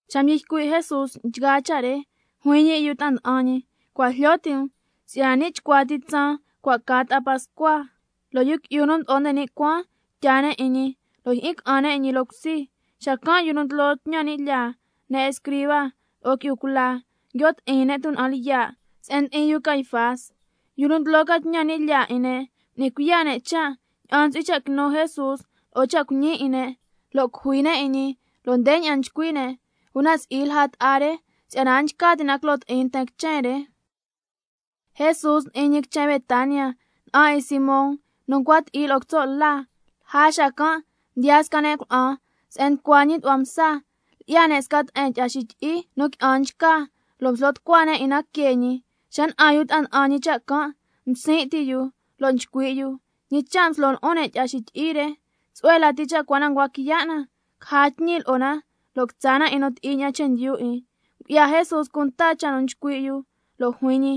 Xa mdyi ycui' Jesús nchgaa cha' re, juin ñi lo'o yu ta'a nda'an ñi: Cua' jlyo ti' um si'yana ni' chcua ti tsaan cua' ca ta'a pascua, lo' Yu Qui'yu nu Mdo'o nde ni' Cuaan tyaa ne' 'in ñi, lo' jyi'in ca'an ne' 'in ñi loo cusi. Lja xacan' yu nu ndlo tñan ni' lyaa lo'o ne' escriba, tsatlyu lo'o qui'yu cula nguio' ti'in ne' tuna'an lyiya' se'en ndi'in yu Caifás, yu nu ndlo ca tñan ni' lyaa 'in ne', m'ni cuiya' ne' cha' ña'an ntsu'hui cha' quinu Jesús lo'o cha' cuiñi 'in ne', lo' cujui ne' 'in ñi. Lo' ndeña'an nchcui' ne': Una si'i lja ta'a re, si'yana a nchca ti' na quilo ti'in nten quichen re. Jesús ndi'in ñi quichen Betania, na'an 'in Simón nu ncua ti'i lo'o quitso' la, lja xacan' mdiyaa sca ne' cuna'an se'en nducua ñi tu'hua msa, lyi'ya ne' sca te'en tyi'a xityi'i nu qui'an nchca, lo' mslo tucua ne' 'in na que ñi. Xa na'an yu ta'a nda'an ñi cha' can', msin' ti' yu lo' nchcui' yu: ¿Ñi cha' mslo lu'un ne' tyi'a xityi'i re? Tsu'hue lati cha' cua na ncua quiya' na, caja tñi lo'o na lo' quitsa na 'in nu ti'i ña'an chendyu 'in. Ngu'ya Jesús cunta cha' nchcui' yu, lo' juin ñi: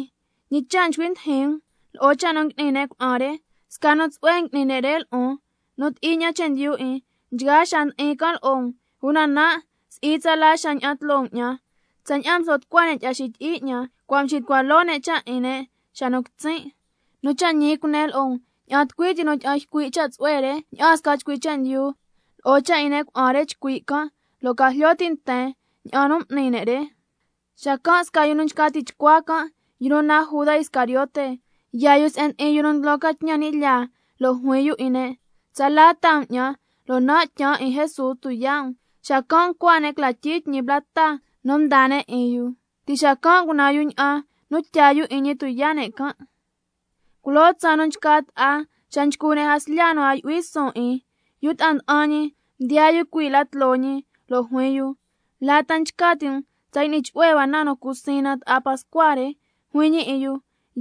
¿Ñi cha' nducui ndijin um lo'o cha' nu ngui'ni ne' cuna'an re? Sca nu tsu'hue ngui'ni ne' lo'on. Nu ti'i ña'an chendyu 'in, nchgaa xaa ndi'in can' lo'o um, una nan' si'i tsala xaa ña'an tloo um 'ñan. Tsaña'an mslo tucua ne' tyi'a xityi'i 'ñan, cua' mxitucua loo ne' cha' 'in ne' xa nu quitsin'. Nu cha' ñi cunen lo'o um, ña'an tucui ti nu tyi'an ycui' cha' tsu'hue re 'ñan sca chcui chendyu, lo'o cha' 'in ne' cuna'an re chcui' can', lo' ca jlyo ti' nten tsaña'an nu m'ni ne' re. Xacan' sca yu nu nchca tichcua can', yu nu naan Juda Iscariote, yaa yu se'en ndi'in yu nu ndlo ca tñan ni' lyaa, lo' juin yu 'in ne': ¿Tsala taa um 'ñan, lo' nan' tyaan 'in Jesús tuyaa' um? —Xacan' ncua ne' cla tyii tñi plata mdaa ne' 'in yu—. Ti' xacan' ngunan yu ña'an nu tyaa yu 'in ñi tuyaa' ne' can'. Culoo tsaan nu nchca ta'a, xa nchcu ne' jaslya nu a yu'hui suun 'in, yu ta'a nda'an ñi mdiyaa yu cui' la tloo ñi, lo' juin yu: ¿La ta nchca ti' um tsa y'ni chu'hue hua na nu cu siin na ta'a pascua re? Juin ñi 'in yu: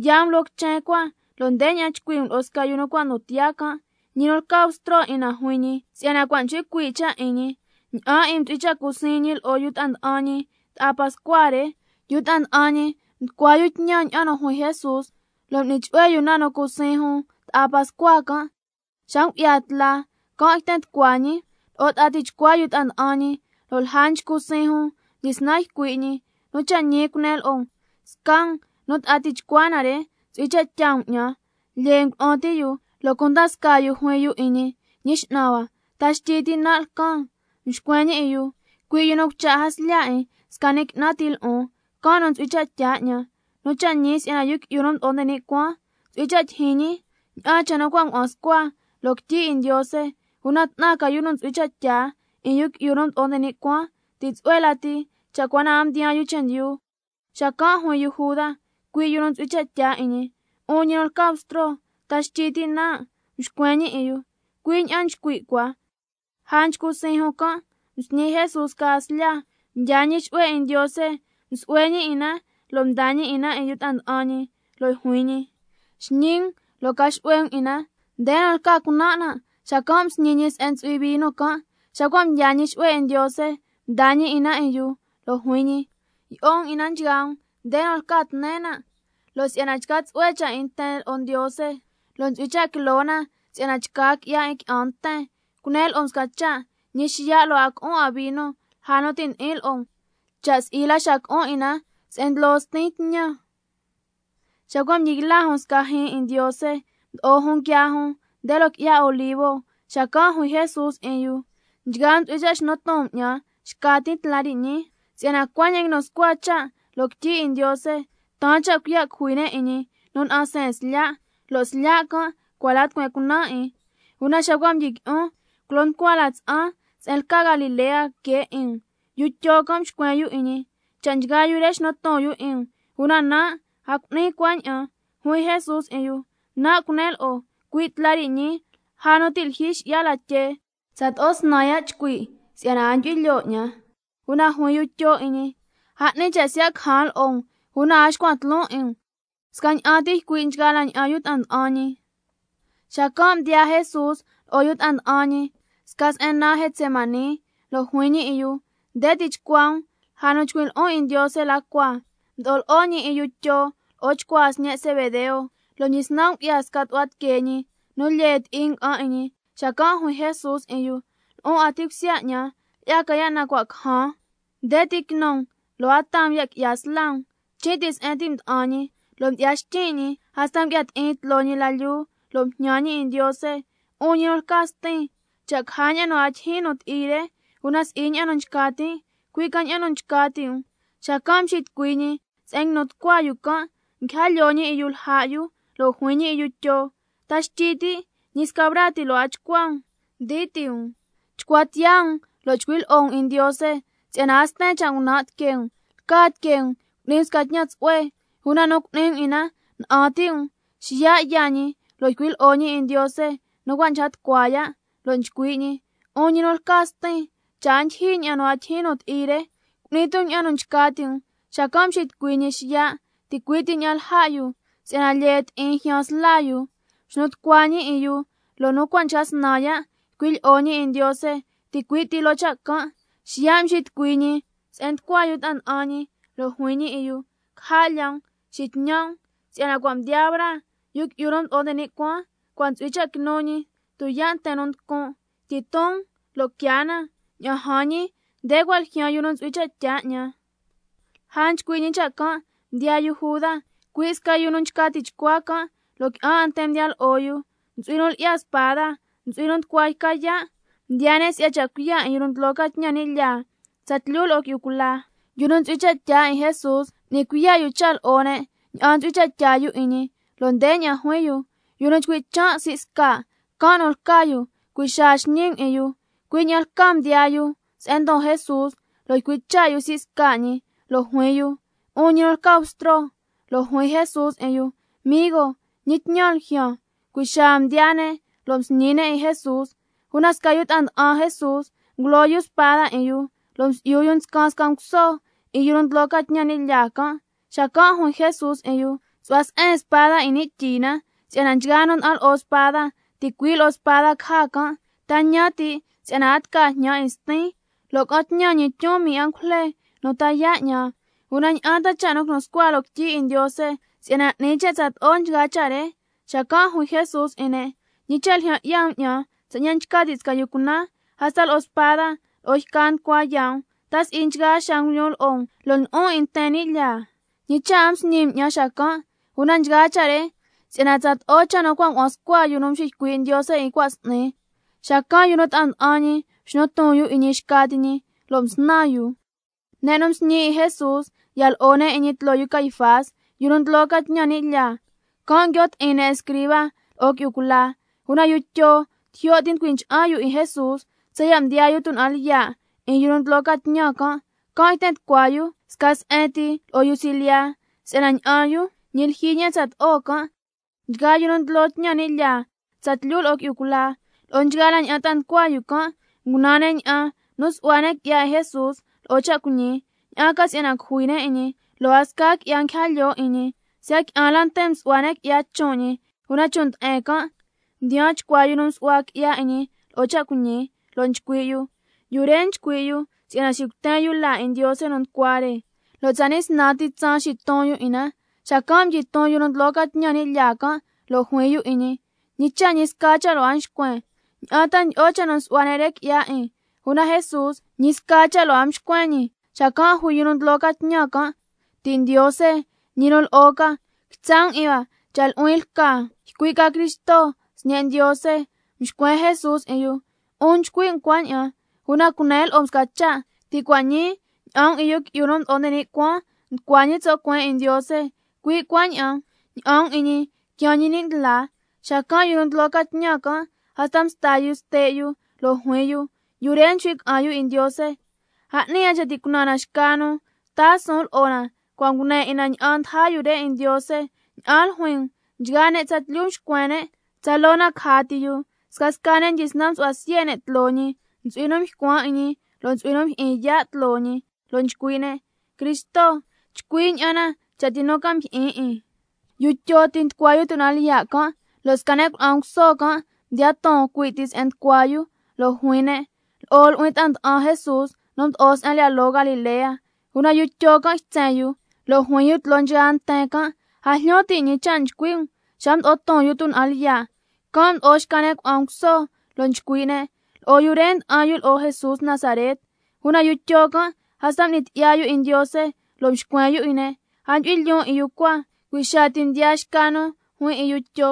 Yaa um loo quichen cua, lo' ndeña'an chcui' um lo'o sca yu nu cua' ndon tiyaa can': Ñi nu lca Bstro 'in na juin ñi si'yana cua' nchcui cuii' cha' 'in ñi. Ña'an 'in um ntsu'hui cha' cu siin ñi lo'o yu ta'a nda'an ñi ta'a pascua re. Yu ta'a nda'an ñi mducua yu tñan ña'an nu juin Jesús, lo' m'ni chu'hue yu na nu cu siin jun ta'a pascua can'. Xa ngu'ya tla can' yten tucua ñi lo'o ta'a tichcua yu ta'a nda'an ñi, lo' lja nchcu siin jun mdyisnan ycui' ñi: Nu cha' ñi cunen lo'o um, sca um nu ta'a nducua na re ntsu'hui cha' tyaa um 'ñan. Lyee ngulu'un ti' yu, lo' cunda scaa yu juin yu 'in ñi: Ñi X'nan hua, ¿ta xtyi ti' nan' lcan? Mxcuen ñi 'in yu: Cui' yu nu cucha' jaslya 'in sca ni' qui'nan ti lo'on, can' nu ntsu'hui cha' tyaa 'ñan. Nu cha' ñi si'yana Yu Qui'yu nu Mdo'o nde ni' Cuaan, ntsu'hui cha' tyijyin ñi ña'an cha' nu cua' ngua'an scua loo quityi 'in Ndiose. ¡Una 'tnan ca yu nu ntsu'hui cha' tyaa 'in Yu Qui'yu nu Mdo'o nde ni' Cuaan! Ti' tsu'hue lati cha' cua na a mdiyaan yu chendyu. Xacan' juin yu Juda, cui' yu nu ntsu'hui cha' tyaa 'in ñi: 'Un ñi nu lca Bstro, ¿ta xtyi ti' nan'? Mxcuen ñi 'in yu: Cui' ña'an nu nchcui' cua. Lja nchcu siin jun can' msñi Jesús sca jaslya, mdyaa ñi xu'hue 'in Ndiose, msu'hue ñi 'in na lo' mdaa ñi 'in na 'in yu ta'a nda'an ñi, lo' juin ñi: Xñi um lo' ca xu'hue um 'in na, nde nu lca cunan' nan'. Xacan' msñi ñi se'en ntsu'hui vino can'. Xa cua' mdyaa ñi xu'hue 'in Ndiose mdaa ñi 'in na 'in yu, lo' juin ñi: Yi'o um 'in na nchgaa um. Nde nu lca tnen nan', lo' si'ya na chca tsu'hue cha' 'in nten lo'o Ndiose, lo' ntsu'hui cha' quilo na, si'yana chca qui'ya 'in qui'an nten. Cunen lo'o um sca cha', ñi xiya' lo' a co'on 'an vino lja nu ti' ndi'in lo'o um, cha' si'i la xa co'o na 'in na se'en ndlo Stin tñan. Xa cua' mdyi yla jun sca jyiin 'in Ndiose, mdo'o jun nguiaa jun nde loo qui'ya Olivo. Xacan' juin Jesús 'in yu: Nchgaa um ntsu'hui cha' xnu ton um 'ñan xcan tin tla re ñii, si'yana cuaña'an nguinu scua sca cha' loo quityi 'in Ndiose: —Taan cha' cuiya' cujui ne' 'in ñi nu na'an seen slya', lo' slya' can' cua' la tucueen cunaan 'in—. Una xa cua' mdyiqui'on, culo nducua la tsa'an se'en lca Galilea que 'in um. Yu Tyo can' mxcuen yu 'in ñi: Cha' nchgaa yu re xnu ton yu 'in um, una nan' a cu'nin cuaña'an. Juin Jesús 'in yu: Nan' cunen lo'o, cui' tla re ñii lja nu ti' lyijyi xi'ya latyee, tsato'o snan ya' chcui' si'yana a ndyu'hui lyoo 'ñan. Una juin yu Tyo 'in ñi: A 'ni cha' siya' cajan lo'o um, una a xcuan tloon 'in um. Scaña'an ti ycui' nchgaa la ña'an yu ta'a nda'an ñi. Xacan' mdiyaa Jesús lo'o yu ta'a nda'an ñi sca se'en naan Getsemaní, lo' juin ñi 'in yu: Nde ti chcua um lja chcui' lyi'on 'in Ndiose la cua. Mdo'o lo'o ñi 'in yu Tyo lo'o chcuaa sñe' Zebedeo, lo' mdyisnan ngu'ya sca tu'hua tiquee ñi nu lyee ti'i nga'an 'in ñi. Xacan' juin Jesús 'in yu: Lu'un 'a ti' cusya 'ñan, lyi'ya ca ya' nu cua' cajan. Nde ti quinu um lo' a taa um ya' qui'ya sla um. Chin' ti se'en ti' mda'an ñi, lo' mdyi'ya xtyin' ñi hasta ngu'ya ti'in tloo ñi la lyuu, lo' mjñan ñi 'in Ndiose lo' juin ñi: 'Un ñi nu lca Stin, cha' caja ña'an nu a tijin nu ti'i re, una si'i ña'an nu nchca tin', cui' ca nu ña'an nu 'un nchca ti' um. Xacan' mxitucui ñi se'en nguinu tucua yu can', nguija lyoo ñi 'in yu lja' yu, lo' juin ñi 'in yu Tyo: ¿Ta xtyi ti' ñi sca braa ti lo' a ncua chcua um ndii ti' um? Chcua tiyaa um lo' chcui' lyi'o um 'in Ndiose, si'yana a sten cha' ngunan' tiquee um. Lca tiquee um cu'ni um sca tñan tsu'hue, una nu cu'ni um 'in na na'an ti' um. Xiya' yaa ñi lo' ycui' lyi'o ñi 'in Ndiose nu cua' nchca tucua ya', lo' nchcui' ñi: 'Un ñi nu lca Stin, cha' a ndyijyi ña'an nu a tijin nu ti'i re, una cu'ni tu um ña'an nu nchca ti' um. Xacan' mxitucui ñi xiya', ticui' ti ña'an lja' yu si'yana lyee ti'in ljyaan sla yu. Mxnu tucua ñi 'in yu, lo' nu cua' nchca snan ya' ycui' lyi'o ñi 'in Ndiose ticui' ti loo cha' can'. Xiya' mxitucui ñi se'en nducua yu ta'a nda'an ñi, lo' juin ñi 'in yu: Caja' lya um, xitñan' um, si'yana cua' mdiyaa braa, Yu Qui'yu nu Mdo'o nde ni' Cuaan ntsu'hui cha' quinu ñi tuyaa' yu nducun'. Tyiton um lo' quiaa na. Ña'an jan ñi, nde cua' ljyaan yu nu ntsu'hui cha' tyaa 'ñan. Lja nchcui' ñi cha' can' mdiyaa yu Juda, cui' sca yu nu nchca tichcua can', lo' qui'an 'a nten mdiya lo'o yu, ntsu'hui nu lyi'ya spada, ntsu'hui nu nducua yca yaa'. Mdiyaa ne' si'ya cha' cuiya' 'in yu nu ndlo ca tñan ni' lyaa tsatlyu lo'o qui'yu cula. Yu nu ntsu'hui cha' tyaa 'in Jesús, m'ni cuiya' yu cha' lo'o ne' ña'an ntsu'hui cha' tyaa yu 'in ñi, lo' ndeña'an juin yu: Yu nu chcui' chan' la sii' sca', can' nu ca lca yu. Cui' xaa xñi um 'in yu. Cui' ña'an lcaa mdiyaa yu se'en ndon Jesús, lo' ycui' cha' yu la sii' sca ñi lo' juin yu: 'Un ñi nu lca Bstro. Lo' juin Jesús 'in yu: Migo, ¿ñi tñan ljyaan? Cui' xaa mdiyaa ne' lo' msñi ne' 'in Jesús. Una sca yu nu ta'a nda'an Jesús ngulo yu spada 'in yu, lo' msi'yu yu nscan sca nguso 'in yu nu ndlo ca tñan ni' lyaa can'. Xacan' juin Jesús 'in yu: Xu'hua se'en spada 'in ni' tyi na, si'yana nchgaa nu nda'an lo'o spada, ticui' lo'o spada caja can'. ¿Ta ñan ti' si'yana a tca jñan 'in Stin, lo' ca'an tñan ñi tyun mii angujle nu ta yaa' 'ñan? Una, ¿ña'an ta quinu cha' nu nguinu scua loo quityi 'in Ndiose, si'yana 'ni cha' tsato'o nchgaa cha' re? Xacan' juin Jesús 'in ne': ¿Ñi cha' ljyan 'ya um 'ñan tsaña'an nchca ti' sca yu cunan, hasta lo'o spada lo'o yca nducua yaa' um? ¿Ta si'i nchgaa xaa nguilyun lo'o um, lo' ndlo'on 'in nten ni' lyaa, ñi cha' a msñi um 'ñan xacan'? Una nchgaa cha' re nchca na, si'yana tsato'o cha' nu cua' ngua'an scua yu nu mxiycui' Ndiose 'in cua' s'ni. Xacan' nchgaa yu ta'a nda'an ñi mxnu ton yu 'in ñi xca ti ñi, lo' msnan yu. Ne' nu msñi 'in Jesús ya lo'o ne' 'in ñi tloo Caifás, yu nu ndlo ca tñan ni' lyaa, can' nguio' ti'in ne' escriba lo'o qui'yu cula. Una yu Tyo tijyo' ti mducui ncha'an yu 'in Jesús, tsaya' mdiyaa yu tuna'an lyiya' 'in yu nu ndlo ca tñan can'. Can' yten tucua yu sca se'en ti lo'o yu silyiya, si'yana ña'an yu ñi lyijyi ña'an tsato'o cha' can'. Nchgaa yu nu ndlo tñan ni' lyaa tsatlyu lo'o qui'yu cula, lo'o nchgaa la ña'an ta'a nducua yu can', ngunan ne' ña'an nu su'hua ne' qui'ya 'in Jesús lo'o cha' cuiñi, ña'an ca si'yana cujui ne' 'in ñi. Lo' a sca qui'ya nguija lyoo 'in ñi, siya' qui'an la nten msu'hua ne' qui'ya chon' ñi. Una chon' nde'en can' mdiyaan chcua yu nu msu'hua qui'ya 'in ñi lo'o cha' cuiñi, lo' nchcui' yu: Yu re nchcui' yu si'yana xicuten yu laa 'in Ndiose nu nducua re, lo' tsani' snan ti tsaan xiton 'in na. Xacan' mdyiton yu nu ndlo ca tñan ni' lyaa can', lo' juin yu 'in ñi: ¿Ñi cha' ñi sca cha' lo' a nxcuen? ¿Ña'an ta ndyi'o cha' nu nsu'hua ne' re qui'ya 'in? Una Jesús ñi sca cha' lo' a mxcuen ñi. Xacan' juin yu nu ndlo ca tñan can': Ti' Ndiose ñi nu lo'o ca, quitsa' 'in hua cha' nu'huin lca ycui' ca Cristo, Sñe' Ndiose. Mxcuen Jesús 'in yu: 'Un nchcui' um cuaña'an. Una cunen lo'o um sca cha': Ti' cua' ñii ña'an um 'in —Yu Qui'yu nu Mdo'o nde ni' Cuaan nducua ñi tso' cueen 'in Ndiose—, cui' cuaña'an ña'an um 'in ñi —quiaan ñi ni' ndlaa—. Xacan' yu nu ndlo ca tñan can' hasta msta yu ste' yu, lo' juin yu: Yu re nchcui' ca'an yu 'in Ndiose. A 'ni 'a cha' cunan na xca nu taa suun lo'o na, si'yana cua' ngune 'in na ña'an ndaja yu re 'in Ndiose. ¿Ña'an ljuin um? Nchgaa ne' tsatlyu mxcuen ne': ¡Tsaloo na caja ti yu! Scasca ne' mdyisnan msu'hua siye' ne' tloo ñi, ntsu'hui nu mycuan' 'in ñi, lo' ntsu'hui nu mjyi'in yaa' tloo ñi, lo' nchcui' ne': Cristo, chcui' ña'an na cha' tucui ca mjyi'in 'in. Yu Tyo ti' nducua yu tuna'an lyiya' can', lo' sca ne' cuna'an nguso mdiya ton cui' ti se'en nducua yu, lo' juin ne': Lo'o nu'huin ta'a nda'an Jesús nu mdo'o se'en lyi'ya loo Galilea. Una yu Tyo can' ytsen yu, lo' juin yu tloo nchgaa nten can': A jlyo tin' ñi cha' nchcui' um. Xa mdo'o ton yu tuna'an lyiya', can' mdo'o ycui' xca ne' cuna'an nguso, lo' nchcui' ne': Lo'o yu re nda'an yu lo'o Jesús Nazaret. Una yu Tyo can' hasta m'nin tyi'ya yu 'in Ndiose, lo' mxcuen yu 'in ne': A ndyu'hui lyoon 'in yu cua. Cui' xaa ti mdiyaa xca nu juin 'in yu Tyo: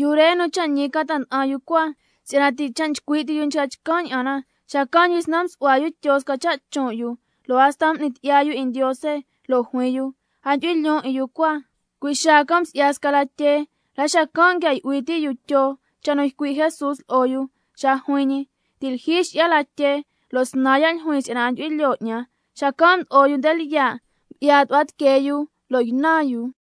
Yu re nu cha' ñi ca ta'a nda'an yu cua, si'yana ti' cha' nchcui' ti chcan' ña'an na. Xacan' mdyisnan msu'hua yu Tyo sca cha' chon' yu, lo' hasta m'ni tyi'ya yu 'in Ndiose, lo' juin yu: A ndyu'hui lyoon 'in yu cua. Cui' xaa can' msi'ya sca latyee. La xacan' nguia yu'hui ti' yu Tyo cha' nu ycui' Jesús lo'o yu xa nu juin ñi: Ti' lyijyi xi'ya latyee, lo' snan ya' ljuin si'yana a ndyu'hui lyoo 'ñan. Xacan' mdo'o yu nde lyiya', ngu'ya tu'hua tiquee yu lo' ynan yu.